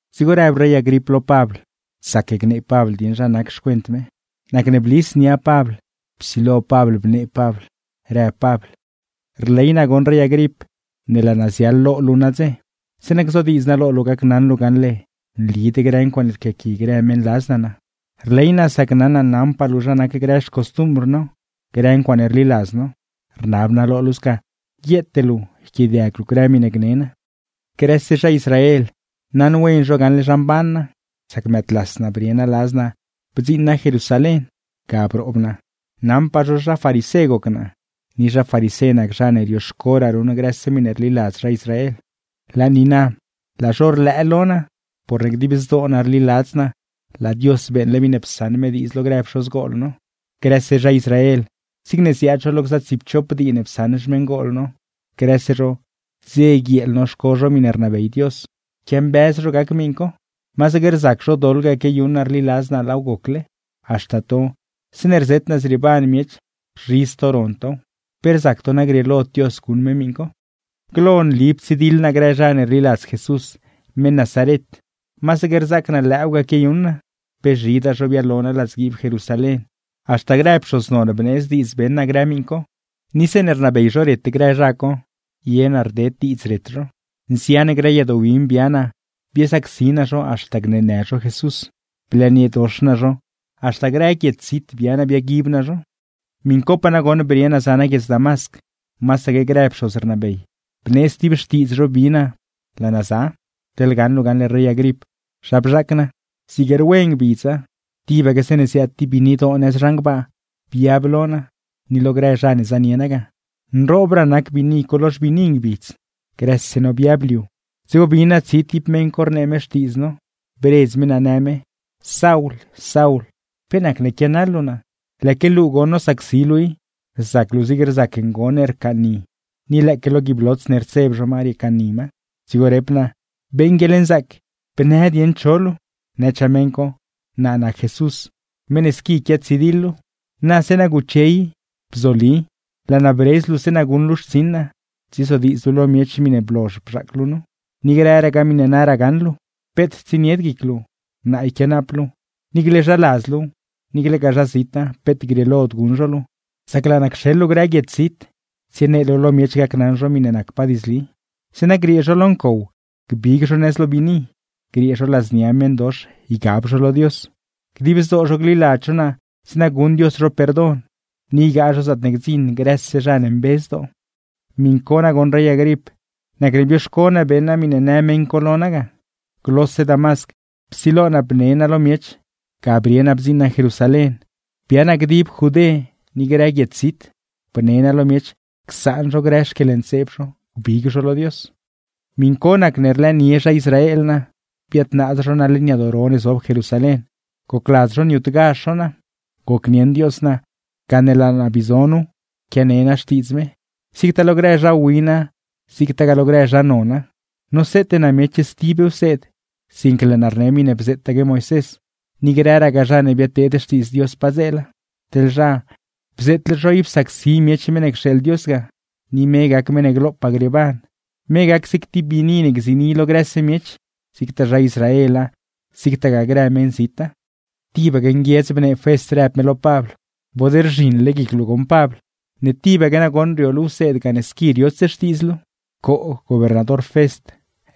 Dzigo rëb rey Agrip lo Pabl, mezhal gnee dieṉ zha naca. Nacne blis nia Pabl psilo Pabl bnee Pabl rëb Pabl: ―Rley naa goṉ rey Agrip ne laa naa ziaḻ lo luu nadze, zeeṉa gzodiidz naa lo luu gacnaṉ luu gaṉle nlid grë ncuaaṉe rquiaqui grë meṉladz naa naa. Rley naa sac naṉ naa naṉpaa luu zha nac grë xcostumbr no, grë ncuaaṉe rliladz no. ¡Rnab naa lo luu sca, guieete luu yquiaadiag luu grë miṉe gne naa! ’Grëse zha Israel naṉ wen zho gaṉle zha mban naa, sac mëëdlas naa bdziṉ naa Jerusalén, ga broob naa. Naṉpaa zho zha farisé goc naa, ni zha farisé nac zha ne rioxcoraa ruṉ grëse miṉe rliladz zha Israel. Per mazd goṉ, laa zho rlëë lo naa porne dib zdoo naa rliladz naa laa Dios beeṉle miṉe psaṉ me diidz lo grë pxozgol no. Grëse zha Israel, zigne ziaad zho lo gza tsiipchop dii ne psaṉ xmeṉgol no, grëse zho dze guieel bii quiambëz zho gac miṉ co. ¡Masaque rzac zho doḻ ga quiayuṉ naa rliladz naa laaw gocle! Haxta to, zeeṉe rzet naa zrieeban miech, rzhidz to ron tow, ¿pe rzac to naa grieelod Dios guṉ me miṉ co? ’Glo nli ptsidiḻ naa grë zha ne rliladz Jesús meṉ Nazaret, masaque rzaac naa lëëw ga quiayuṉ naa. Pe zhidaa zha ne blo naa ladzguiib Jerusalén, haxta grë pxoz non bneedz diidz beṉ naa grë miṉ co; ni zeeṉe rnabey zho ret grë zha co, ye naa rded diidz ret zho. Nzian grë yadoo win bia naa, biasacsi naa zho haxta gneenë zho Jesús. Blëëniedox naa zho, haxta grë guiedz zit bia naa biaguib naa zho. ’Miṉ copaa nagoṉ brie naa za naa guiedz Damasc, masaque grë pxoz rnabey bneedz ti xtiidz zho bi naa laa naa za. Teḻ gaṉ luu gaṉle rey Agrip zha bzhaac naa: Zig rwe ngbidza, tibaque zeeṉe ziaad ti biinidoo nëz zhan gbaa biab lo naa, ni lo grë zha ne zanie naa ga, nroobraa nac biini co lo xbiini ngbidz. Grëse no biab liu, dzigo bin naa ti tsi meṉ co rnee me xtiidz no, bredz me naa në me: “Saul, Saul, ¿pe nacne quianaḻ luu naa? Lëëque luu goṉ nosacsi luu i, rzac luu zigne rzac ngon ne rcaaṉni, ni lëëque lo guiib lots ne rtseb zho ma riecaaṉni ma.” Dzigo rep naa: “Beeṉ guieḻnzaac bnë dieṉ cho luu.” Nëchaa meṉ co: “Naa nac Jesús, meṉ ne squi quiatsidiḻ luu. ¡Na zeeṉa guche i, bzoli! Laa naa bredz luu zeeṉa guṉ luu xtsiṉ naa, tsiezodiidz luu lo miech miṉe blozh bzhaac luu nu, ni grëragaa miṉe naraa gaṉ luu. Peet tsienied guic luu, naa yquianaap luu, niicle zhaladz luuw niiclegaa zha zita peet grieelod guṉ zho luu. Sac laa naa cxeḻ luu grë guiedz zit tsienee luu lo miech gacnaṉ zho miṉe nacpaa diidzli, zeeṉa griee zho lo ncow gbig zho nëz lo biini, griee zho ladznia meṉdox ygab zho lo Dios. Dib zdoo zho gliladz zho naa zeeṉa guṉ Dios zho perdon, ni ygaa zho zaatne gdziṉ grëse zha ne mbe zdoo.” ’Miṉ co nagoṉ rey Agrip nacne bioxco naa beṉ naa miṉe në meṉ co lo naa ga. Glose Damasc psilo naa bne naa lo miech, ga brie naa bdziṉ naa Jerusalén, bia naa dib Judé ni grë guiedz zit, bne naa lo miech csaan zho grë xquieḻntseeb zho gbig zho lo Dios. ’Miṉ co nagoṉ nacne rlëënie zha Israel naa, biadnaaz zho naa leṉ yadoo ro ne zob Jerusalén, gocladz zho niutgazh zho naa. Gocnieṉ Dios naa, gane laa naa bii zo nu quiane naa Xtiidz me zigtaa lo grë zha wina zigtagaa lo grë zha nona. Noseete naa miech stib wseed, sinque laa naa rne miṉe bzeetaque Moisés ni grëragaa zha ne biadteed xtiidz Dios padzeela. Teḻ zha, bzeetle zho ib sacsi miech meṉ ne cxeeḻ Dios ga, ni me gac meṉ ne glopaa grieeban, me gac zig ti biini ne gziini lo grëse miech, zigtaa zha Israela zigtagaa grë meṉzita. Tibaque nguiedz bnee Fest rëb me lo Pabl: ―¡Bod rzhiṉle guic luu goṉ Pabl! ¡Ne tibaque nagoṉ rio luu wseed gane squi riots xtiidz luu! ―Coo, gobernador Fest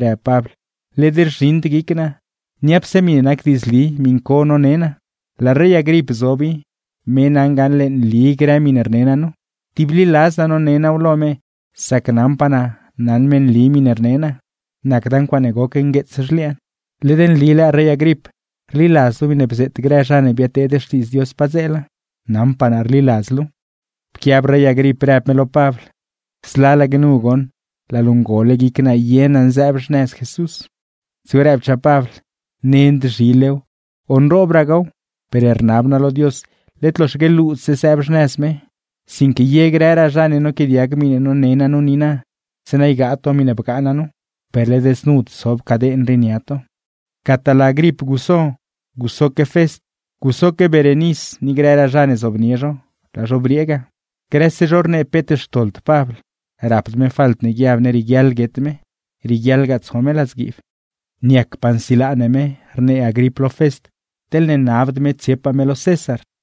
―rëb Pabl―, led rzhiṉd guic naa. Niapse miṉe nac diidzli miṉ co none naa, laa rey Agrip zob i, me naṉ gaṉle nli grë miṉe rne naa nu. Tibliladz naa none naaw lo me, sac naṉpaa naa naṉ me nli miṉe rnee naa, nacda ncuaaṉe goc ngueets zhliaan. ¿Led nli lëë rey Agrip rliladz luu miṉe bzeet grë zha ne biadteed xtiidz Dios padzeela? Naṉpaa naa rliladz luuw. Pquiab rey Agrip, rëb me lo Pabl: ―¡Zlalaque nu goṉ laa luu cole guic naa ye naa sëëb xnëz Jesús! Dzigo rëbchaa Pabl: ―¡Nend zhilew o nroobragaaw, per rnab naa lo Dios led loxaque luudse sëëb xnëz me, sinque ye grëraa zha ne noquiaadiag miṉe none naa nu niina; zeeṉa ygaa to miṉe bgaa naa nu, per led znud sob caden rii nia to! Gataa laa Agrip guso, gusoque Fest, gusoque Berenis ni grëraa zha ne zobnie zho, laa zho briee ga. Grëse zho rnee peet xtoḻd Pabl, rapd me falt ne guiab ne rieguiaḻ guet me, rieguiaḻgaa tso me ladzguiib. ―Niacpaa nsilaa ne me ―rnee Agrip lo Fest―, teḻne nabd me tsiepaa me lo César.